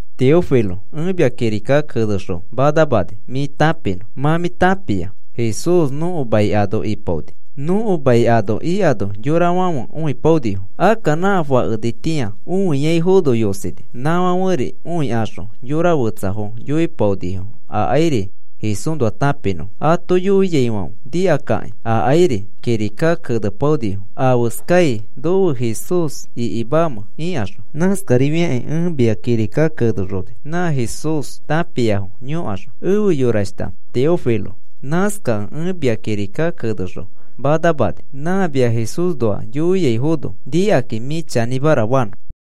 Teófilo, ẽ mia kirika kenexõ manamani, mĩ tãpinõ. Mã mĩ tãpia Jesús nõko mai ano ipaoni. Nõko mai ano ikano yorafãfe õipaonifo. Akka nã fakenitĩa õiaifono yosini. Nãfãferi õikaxõ yora fetsafo yoipaonifo akairi Jesúsnoa tãpinõfo. Ato yoiaifãfe nikakakĩ akairi kirika kenepaonifo afeskai nofe Jesús ikimamẽ ikaxõ. Nãskarifiakĩ ẽ mia kirika kenexoni, nã Jesús tãpiafo yõkaxõ. Efe yorashta Teófilo, nãskakẽ ẽ mia kirika kenexõ manamani, nã mia Jesúsnoa yoiaifono nikakĩ mĩ chanĩmara fanõ.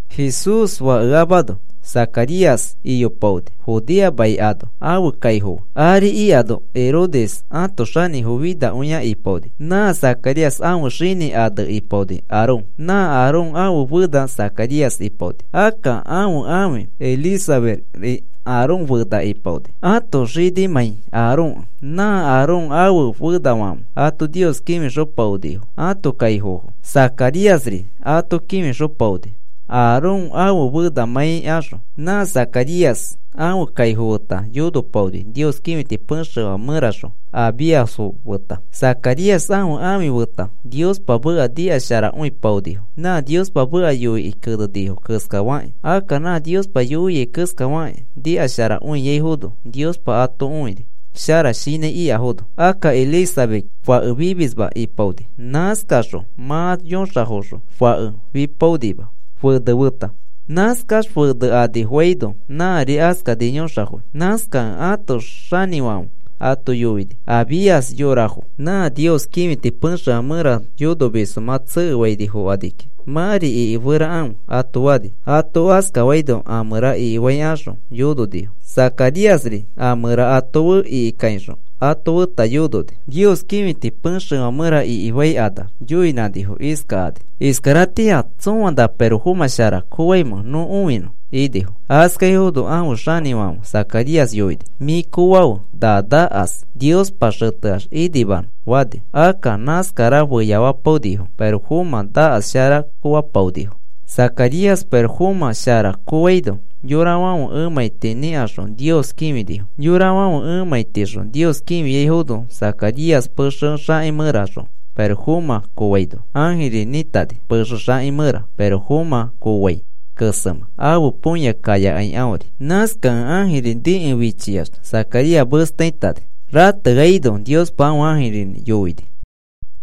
Jesús fakeamano Zacarías iyopaoni Judea mai ano ãfe kaifo fe. Ari ikano Herodes ãto xanĩfo finakõia ipaoni. Nã Zacarías ãfe xini ane ipaoni Aarón. Nã Aarón ãfe fena Zacarías ipaoni. Akka ãfe ãfi Elizabetri Aarón fena ipaoni, ãto xinimãi Aarónkẽ. Nã Aarón ãfe fenafãfe ato Nios kĩfixopaonifo ãto kaifofo. Zacaríasri ato kĩfixopaoni Aarón ãfe fenamãi axõ. Nã Zacarías ãfe kaifo feta yonopaoni, Nios kĩfiti pexefã mẽraxõ Abíasfo feta. Zacarías ãfe ãfi feta Niospa meka nikasharakõipaonifo, nã Niospa meka yoikĩ kenenifo keskafakĩ. Akka nã Niospa yoiai keskafakĩ nikasharakõiaifono Niospa ato õini, shara shinãi ikafono. Akka Elisabet fake fimisma ipaoni. Nãskaxõ mã yõxafoxõ fake fipaonima fene feta. Nãskax fene anifoaino nãri askani yõxafoi. Nãskakẽ ãto xanĩfãfe ato yoini, Abías yorafo: “Nã Nios kĩfiti pexefã mẽra yonomisfo mã tsekefaini fokani kiki. Mãri ikiferakãfe,” ato fani. Ato askafaino a mẽra ikifaikaxõ yononifo. Zacaríasri a mẽra ato fe ikikaixõ ato feta yononi. Nios kĩfiti pexefã mẽra ikifaikanax yoinãnifo iskakani: “¿Iskaratĩa tsõa na pirofomã shara koofaimẽ nõ õinõ?” inifo. Askaifono ãfe xanĩfãfe Zacarías yoini: “Mĩ koofafe na nakas Niospa xeteax inimanõ,” fani. Akka nãskara feyafapaonifo, pirofomã nakas shara koofapaonifo. Zacarías pirofomã shara koofaino yorafãfe emãiti nikaxõ Nios kĩfinifo. Yorafãfe emãitixõ Nios kĩfiaifono, Zacarías pexefã xãki mẽraxõ pirofomã koofaino ãjiri nĩtani, pexe xaki mẽra pirofomã koofai kesemẽ ãfe põya kayakai aõri. Nãskakẽ ãjiri nikẽ fichiax Zacarías mesta itani. Rateaino Niospa ãfe ãjirinĩ yoini: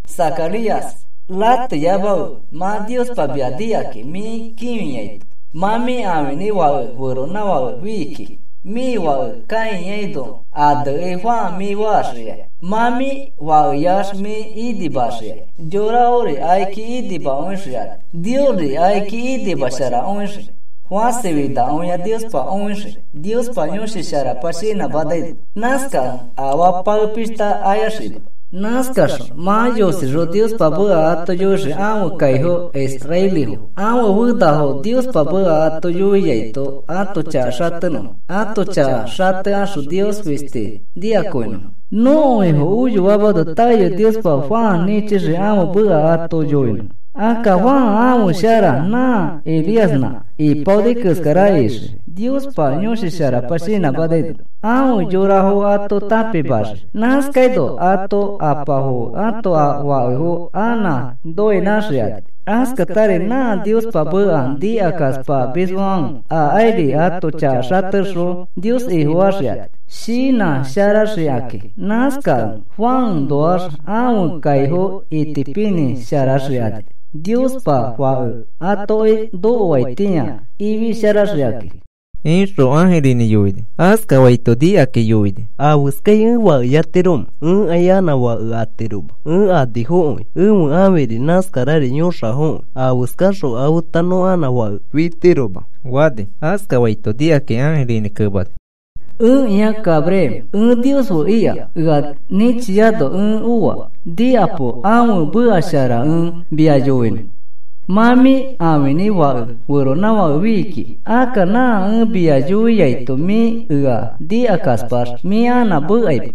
“Zacarías, rateyamafe. Mã Niospa mia nikakĩ mĩ kĩfiaito mã mĩ ãfinĩ fake feronãfake fii kiki. Mĩ fake kãiano anekĩ Juan mĩ faxikai. Mã mĩ fakeyax mĩ inimaxikai. Yorafori akiki inimakõixikani. Niosri akiki inimasharakõixii. Fãsi finakõia Niospa õixii, Niospa Yõshi Sharapa shinãmanaino. Nãskakẽ afaa pae pishta ayaxima. Nãskaxõ mã yosixõ Niospa meka ato yoixii ãfe kaifo israelifo ãfe fenafo, Niospa meka ato yoiaino ãto chaka xatenõfo. Ãto chaka xatekaxõ Nios fisti nikakõinõfo. Nõko Ifo oyoamano taeyoi Niospa Juan nĩchixii ãfe meka ato yoinõ. Akka Juan ãfe shara nã Elíasnã ipaoni keskara ixii Niospa Yõshi Sharapa shinãmanaino. Afe yorafo ato tãpimaxii. Nãskaino ãto apafo fe ãto fakefo anã noinãxikani. Askatari nã Niospa meka nikakaspamisfãfe akairi ãto chaka xatekaxõ Nios Ifofaxikani shinãsharaxikakĩ. Nãskakẽ Juanoax ãfe kaifo itipinĩsharaxikani Niospa Fake atoki nokoaitĩa ifisharaxikakĩ,” ixõ ãjirinĩ yoini. Askafaito nikakĩ yoini: “¿Afeskai ẽ fakeyatiromẽ? Ẽkai anã fake atiroma ẽ anifokõi. Ẽfe ãfiri nãskarari yõxafokõi. Afeskaxõ afeta nõ anã fake fitiroma,” fani. Askafaito nikakĩ ãjirinĩ kemani: “Ẽkĩa Gabriel, ẽ Nios fe ika. Ea nĩchiano ẽ oa. Nikapo, ãfe meka shara ẽ mia yoinõ. Mã mĩ ãfinĩ fake feronãfake fii kiki. Akka, nã ẽ mia yoiaito mĩ ea nikakaspax mĩ anã mekaima.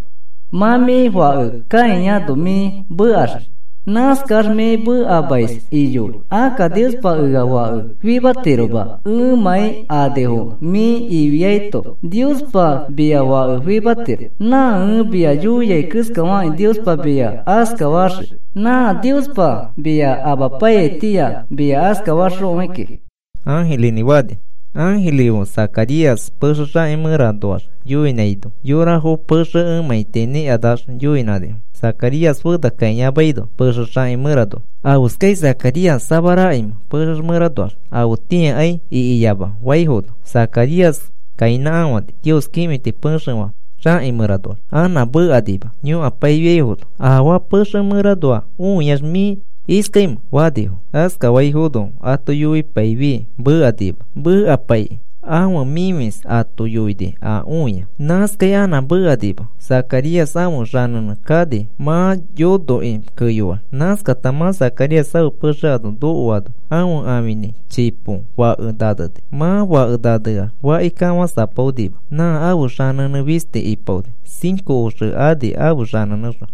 Mã mĩ fake kãiano mĩ mekaxii. Nãskax mĩ mekamais iyoi. Akka Niospa ea fake fimatiroma ẽmãi anifokẽ mĩ ifiaito Niospa mia fake fimatiro. Nã ẽ mia yoiai keskafakĩ Niospa mia askafaxii. Nã Niospa mia apaiyaitĩa mia askafaxõi kiki,” ãjirinĩ fani. Ãjiri fe Zacarías pexe xaki mẽranoax yoinãino yorafo pexe emãiti nikanax yoinãnifo, Zacarías fena kãiyamaino pexe xaki mẽranoa. “¿Afeskai Zacarías samarakaimẽ pexe mẽranoax? Afetĩakai ikiyama,” faifono Zacarías kainãkafani Nios kĩfiti pexefã xakĩ mẽranoax anã mekanima yõkapaifiaifono. “¿Afaa pexefã mẽranoa õiax mĩ iskaimẽ?” fanifo. Askafaifono ato yoipaifi mekanima. Mekapaikĩ ãfe mĩfis ato yoini a õia. Nãskai anã mekaima Zacarías ãfe xanẽnẽ kani mã yonokĩ keyoax. Nãskata mã Zacarías ãfe pexe ano nokoano ãfe ãfinĩ chipo fake naneni. Mã fake naneax faki kafãsapaonima nã ãfe xanẽnẽ fisti ipaoni cinco oxe ani ãfe xanenẽxõ.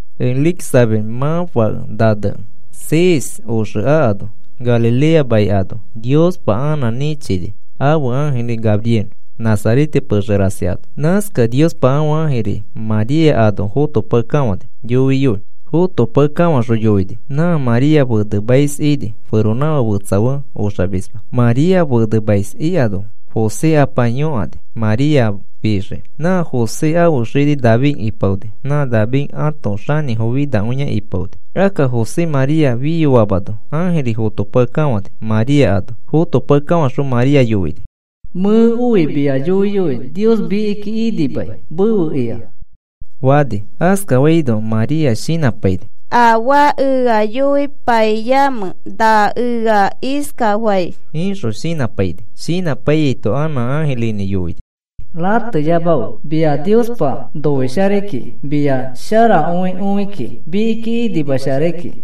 Elisabet mã fake nanekĩ seis oxe akano Galilea mai ano Niospa anã nĩchini ãfe ãjiri Gabriel, Nazarete pexe rasi ano. Nãskakẽ Niospa ãfe ãjiri María ano fotopakekafãni yoiyoi. Fotopakekafaxõ yoini. Nã María fenemais ini. Feronãfake fetsa fe oxamisma. María fenemais ikano José apa yõkani, María fixiki. Nã José ãfe xini David ipaoni. Nã David ãto xanĩfo finakõia ipaoni. Akka José María fiyoamano ãjiri fotopakekafãni, María ano. Fotopakekafãxõ María yoini: “Mẽ oi mia yoiyoi, Nios mikiki inimai mefe ika,” fani. Askafaino María shinãpaini: “¿Afaa ea yoipaimẽ, na ea iskafai?” ixõ shinãpaini. Shinãpaiyaito anã ãjirinĩ yoini: “Rateyamafe. Mia Niospa noisharai kiki mia sharakõi õi kiki, mikiki inimasharai kiki.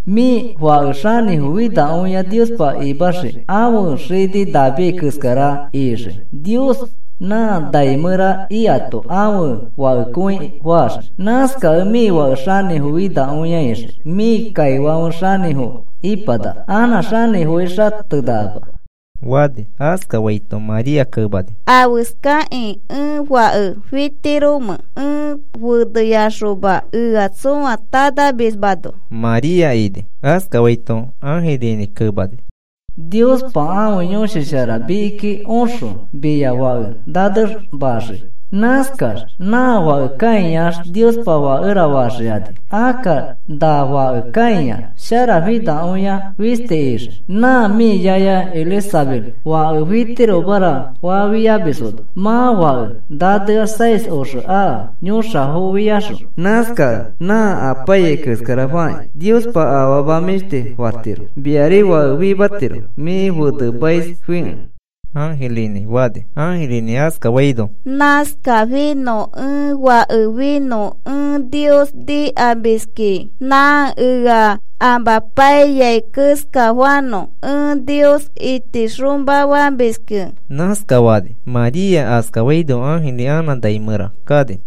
Mĩ fake xanĩfo finakõia Niospa imaxii. Ãfe xini David keskara ixii. Nios nã nai mẽra ikato ãfe Fakekõi faxii. Nãskakẽ mĩ Fake xanĩfo finakõia ixii. Mĩ kaifãfe xanĩfo ipanaka. Anã xanĩfoi xatenakama,” fani. Askafaito María kemani: “¿Afeskakĩ ẽ fake fitiromẽ ẽ feneyaxoma, ea tsõa tanamismano?” María ini. Askafaito ãjirinĩ kemani: “Niospa ãfe Yõshi Shara mikiki oxõ mia fake nanemaxii. Nãskax nã fake kãiax Niospa Fakera faxikani. Akka na fake kãiax sharafinakõia fisti ixii. Nã mĩ yaya Elisabet ‘Fake fitiromara’ fafiamisfono mã fake nanea seis oxe aka yõxafofiaxõ. Nãskakẽ nã apaiyai keskara fakĩ Niospa afama mĩshti fatiro. Miari fake fimatiro mĩ fenemaisfikẽ,” ãjirinĩ fani. Ãjirinĩ askafaino, “Nãskafinõ, ẽ fake finõ, ẽ Nios nikamiskĩ. Nã ea amapaiyai keskafanõ ẽ Nios itixomafamiski,” nãskafani. María askafaino ãjiri anã nai mẽra kani.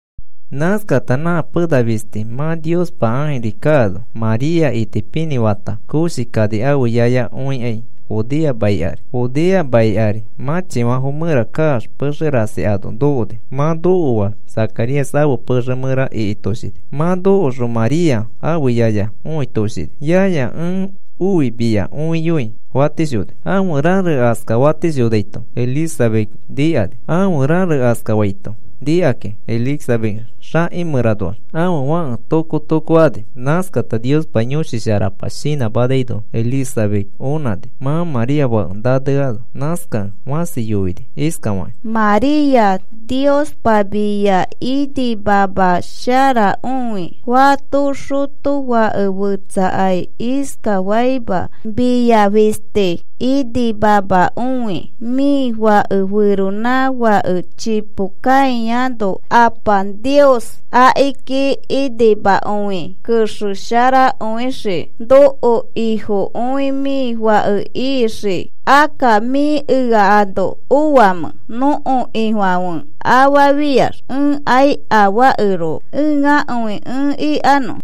Nãskata nã pena fisti mã Niospa ãjiri kaano María itipinĩ fata koshi kani ãfe yaya õikai Judea mai ari. Judea mai ari mãchifãfo mẽra kaax pexe rasi ano nokoni. Mã nokoax Zacarías ãfe pexe mẽra ikitoshini. Mã nokoxõ María ãfe yaya yoitoshini. “Yaya, ẽ oi mia õiyoi,” fatishoni. Ãfe rare askafatishonaito Elizabet nikani. Ãfe rare askafaito nikakĩ Elisabet xakĩ mẽraxõ ãfe fake tokko tokko ani. Nãskata Niospa Yõshi Sharapa shinãmanaino Elisabet onãni mã María fake naneano. Nãskakẽ fãsi yoini iskafakĩ: “María, Niospa mia inimamasharakõi. Fato xotofake fetsakai iskafaima mia fisti inimamakõi. Mĩ fake feronãfake chipo kãiano Apa Niospa akiki inimakõikĩ kexesharakõixii. Nõko Ifokõi mĩ fake ixii. Akka, ¿mĩ ea ano oamẽ, nõko Ifãfe afafiax ẽkai afaakeroko ẽakõi ẽ ikanõ?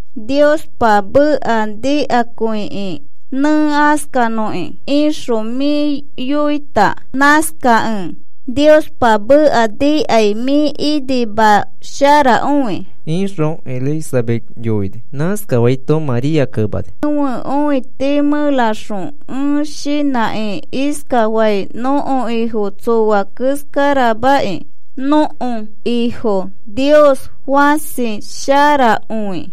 Niospa meka nikakõikĩ, ‘Nẽ askanõki,’ ixõ mĩ yoita. Nãskakẽ Niospa meka nikai mĩ inimasharakõi,” ixõ Elisabet yoini. Nãskafaito María kemani: Ẽfe õiti mẽraxõ ẽ shinãkĩ iskafai, nõko Ifo tsoa keskaramãkĩ. Nõko Ifo Nios fãsi sharakõi.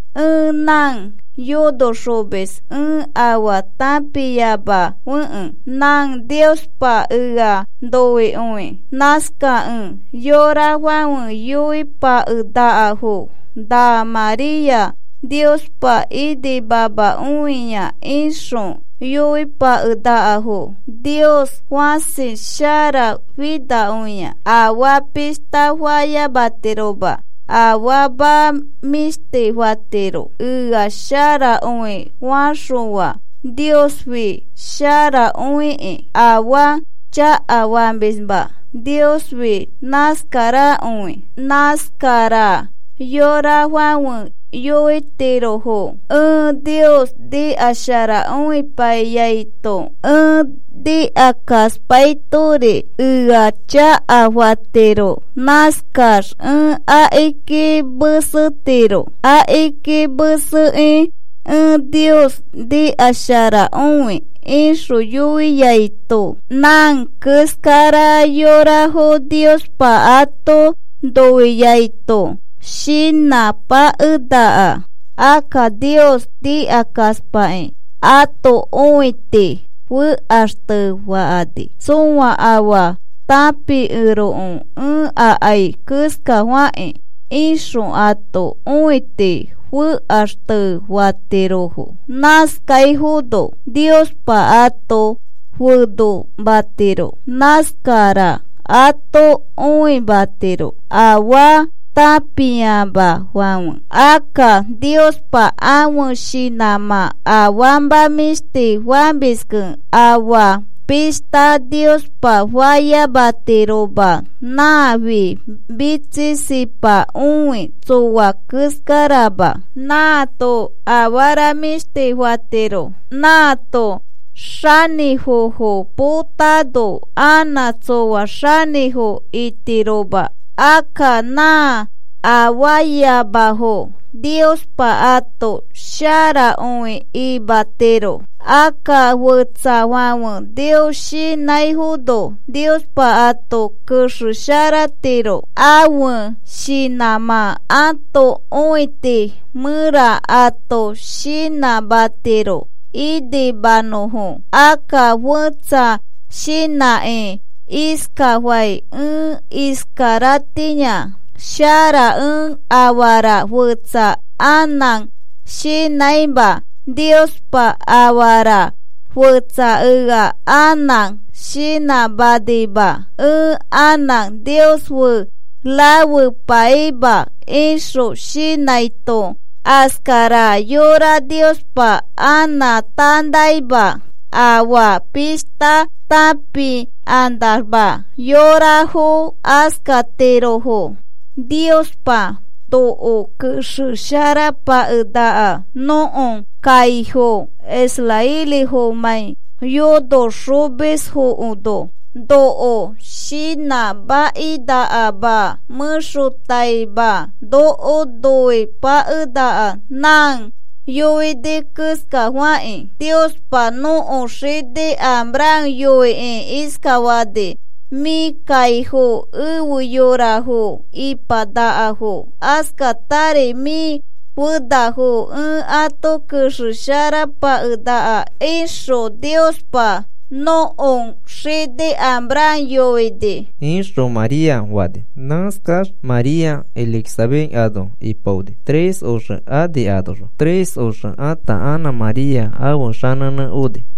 Ẽ nã yonoxomis, ẽ afaa tãpiamafekẽ nã Niospa ea noikõi. Nãskakẽ yorafãfe yoipakenakafo: “Nã María Niospa inimamakõia,” ixõ yoipakenakafo. Nios fãsi sharafinakõia. Afaa pishta fayamatiroma. Afama mĩshti fatiro, ea sharakõi faxõa. Niosfi sharakõiki. Afaa chakafamisma Niosfi nãskarakõi. Nãskara yorafãfe yoitirofo: “Ẽ Nios nikasharapaikõiaito, ẽ nikakaspaitori ea chakafatiro. Nãskax ẽ akiki mesetiro. Akiki mesekĩ ẽ Nios nikasharakõi,” ixõ yoiaito nã keskara yorafo Niospa ato noikĩ ato shinãpakenaka. Akka Nios nikakaspakĩ ãto õiti fekaxtefakani, “Tsõa afaa tãpikeroko ẽ akai keskafakĩ,” ixõ ãto õiti fekaxtefatirofo. Nãskaifono Niospa ato fenomatiro. Nãskara ato õimatiro afaa tãpiamafãfe. Akka Niospa ãfe shinãmã afama mĩshti famiski. Afaa pishta Niospa fayamatiroma. Nãfi mitsisipakõikĩ tsoa keskarama. Nãato afara mĩshti fatiro. Nãato xanĩfofo potano anã tsoa xanĩfo itiroma. Akka nã afaayamafo Niospa ato sharakõi imatiro. Akka fetsafãfe Nios shinãifono Niospa ato kexesharatiro. Ãfe shinãmã ãto õiti mẽra ato shinãmatiro inimanõfo. Akka fẽtsa shinãkĩ iskafai: “Ẽ iskaratĩa shara ẽ afara fetsa anã shinãima Niospa afara fetsa ea anã shinãmanima ẽ anã Nios fe rafepaima,” ixõ shinãito askara yora Niospa anã tanaima. Afaa pishta tãpikanamax yorafo askatirofo. Niospa noko kexesharapakenaka nõko kaifo israelifãfemãi yonoxomisfono. Noko shinãmakinakama mẽxotaima noko noipakenaka nã yoini keskafakĩ. Niospa nõko xini Abraham yoikĩ iskafani: “Mĩ kaifo efe yorafo ipanakafo. Askatari mĩ fenafo ẽ ato kexesharapakenaka,” ixõ Niospa nõko xini Abram yoini, ixõ María fani. Nãskax María Elizabet ano ipaoni tres oxe ani anoxõ. Tres oxe ata anã María ãfe xanẽnẽ oni.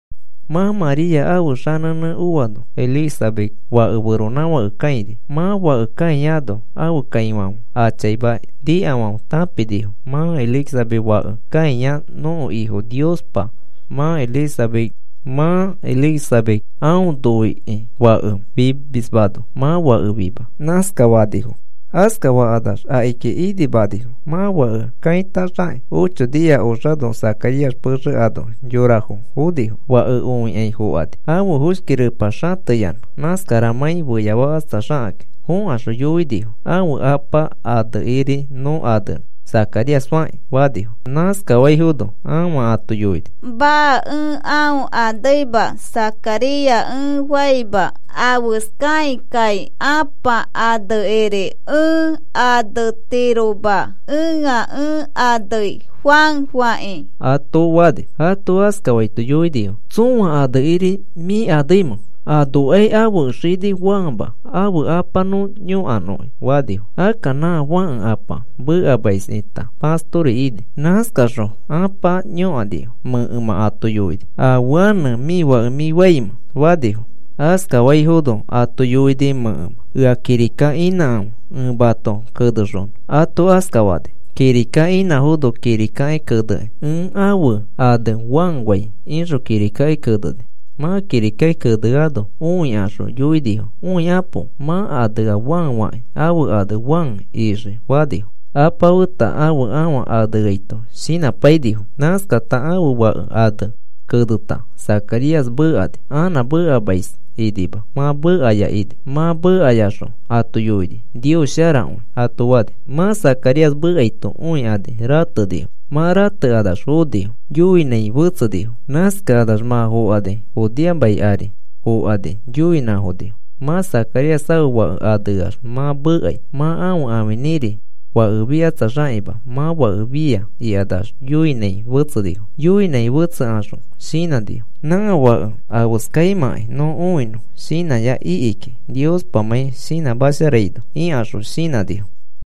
Mã María ãfe xanẽnẽ oano Elisabet fake feronãfake kãini. Mã fake kãiano ãfe kaifãfe a chaima nikafãfe tãpinifo. “Mã Elisabet fake kãia nõko Ifo Niospa mã Elisabet aõ noikĩ fake fimismano mã fake fima,” nãskafanifo. Askafakanax akiki inimanifo. Mã fake kãitaxakĩ ocho nia oxano Zacarías pexe ano yorafo fonifo. Fake õikai fokani ãfe foshki repa xateyanã nãskaramãi feyafakatsaxakakĩ. Fokaxõ yoinifo: “Ãfe apa anekiriri nõ anenõ Zacarías fakĩ,” fanifo. Nãskafaifono ãfa ato yoini: “Maa, ẽ aõ aneima, Zacarías ẽ faima. Afeskakĩkai apa anekiri ẽ anetiroma. Ẽa ẽ anei Juan fakĩ,” ato fani. Ato askafaito yoinifo: “¿Tsõa anekiri mĩ aneimẽ? Anokai ãfe xinifo Juanma. Ãfe apa nõ yõkanõki,” fanifo. Akka nã fãke apa mekamais ita pastori ini. Nãskakaxõ apa yõkanifo. Mẽkemã ato yoini: “¿Afe ane mĩ fake mĩ faimẽ?” fanifo. Askafaifono ato yoini mẽkemã: “Ea kirika inãkãfe, ẽ mato kenexonõ,” ato askafani. Kirika inãfono kirikaki kenekĩ: “Ẽ ãfe ane Juan fai,” ixõ kirikaki keneni. Mã kirikaki keneano õikaxõ yoinifo: “Õikapo. Mã anea Juan fakĩ. Ãfe ane Juan ixii,” fanifo, apa feta ãfe ãfa aneaito shinãpainifo. Nãskata ãfe fake ane keneta Zacarías mekani. Anã mekamais inima, mã mekaya ini. Mã mekayaxõ ato yoini: “Nios sharakõi,” ato fani. Mã Zacarías mekaito õikani ratenifo. Mã ratekanax fokani yoinãi fetsenifo. Nãskakanax mã fokani Judea mai ari fokani yoinãfonifo: “Mã Zacarías ãfe fake aneax mã mekai. Mã ãfe ãfinĩri fake fikatsaxakima, mã fake fia,” ikanax yoinãi fetsenifo. Yoinãi fetsekaxõ shinãnifo: “Nã fake afeskaimãkai nõ õinõ shinãya iki kiki, Niospamãi shinãmasharaino,” ikaxõ shinãnifo.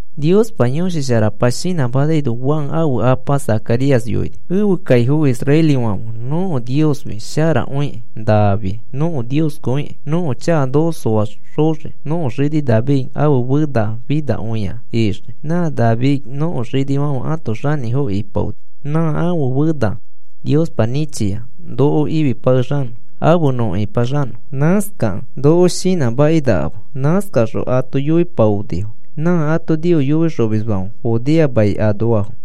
Niospa Yõshi Sharapa shinãmanaino Juan ãfe apa Zacarías yoini: Ẽfe kaifo israelifãfe nõko Niosfi sharakõikĩ, nãfi nõko Ifokõikĩ. Nõko chaka noko soaxoxii. Nõko xini David ãfe fena finakõia ixii. Nã David nõko xinifãfe ãto xanĩfo ipaoni. Nã ãfe fena Niospa nĩchia noko ifipakexanõ afe nõ ĩpaxanõ. Nãskakẽ noko shinãmakinakama. Nãskakaxõ ato yoipaonifo, nã ato Nios yoixomisfãfe Judea mai anoafo.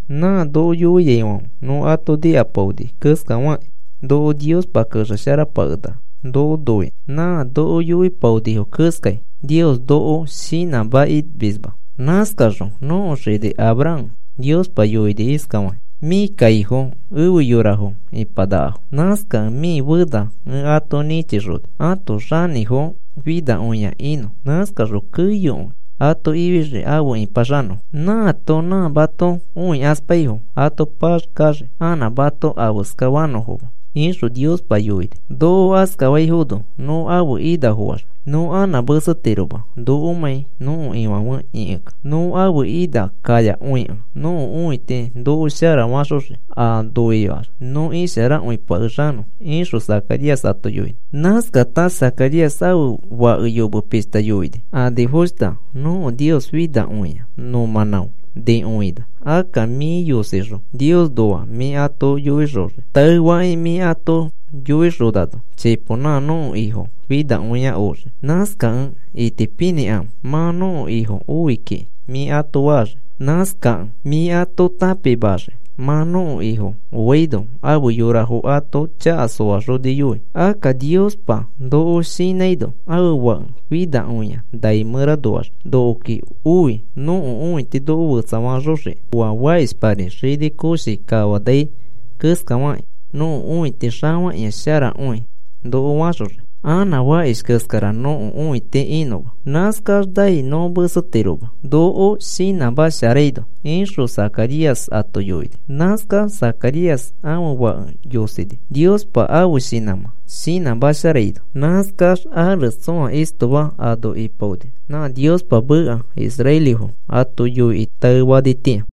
Nã noko yoiaifãfe nõ ato nikapaoni keskafakĩ noko Niospa kexesharapakenaka noko noikĩ. Nã noko yoipaonifo keskai Nios noko shinãmakimisma. Nãskaxõ nõko xini Abraham Niospa yoini iskafakĩ: “Mĩ kaifo efe yorafo ipanakafo. Nãskakẽ mĩ fena ẽ ato nĩchixoni ãto xanĩfo finakõia inõ. Nãskaxõ keyokõi ato ifixii afe ĩpaxanõfo. Nãato nã mato õikaspaifo ato paxkaxii anã mato afeskafanõfoma,” ixõ Niospa yoini. Noko askafaino nõ ãfe inafoax nõ anã mesetiroma nokomãi nõko Ifãfe ĩkikẽ. Nõ ãfe ina kayakõikẽ nõko õiti noko shara faxoxii aa noiax nõ isharakõipakexanõ, ixõ Zacarías ato yoini. Nãskata Zacarías ãfe fake yome pishta yoini: Anifoshta, nõko Nios finakõia nõ mãnão nikõina. Akka mĩ yosixõ Niosnoa mĩ ato yoixoxii. Taefakĩ mĩ ato yoixonano chipo nã nõko Ifo finakõia oxii. Nãskakẽ itipinĩkãfe mã nõko Ifo oi kiki mĩ ato faxii. Nãskakẽ mĩ ato tãpimaxii mã nõko Ifo oaino afe yorafo ato chaka soaxoniyoi. Akka Niospa noko shinãino ãfe Fake finakõia nai mẽranoax nokoki oi nõko õiti noko sharafaxoxiki. Oa fakishpari xini koshi kafanai keskafakĩ nõko õiti xafakĩa sharakõi noko faxoxiki, anã fakish keskara nõko õiti inõma. Nãskax nai nõ mesetiroma noko shinãmasharaino, ixõ Zacarías ato yoini. Nãskax Zacarías ãfe fake yosini Niospa ãfe shinãmã shinãmasharaino. Nãskax ares tsõa istoma ano ipaoni, nã Niospa meka israelifo ato yoikĩ taefaitĩa.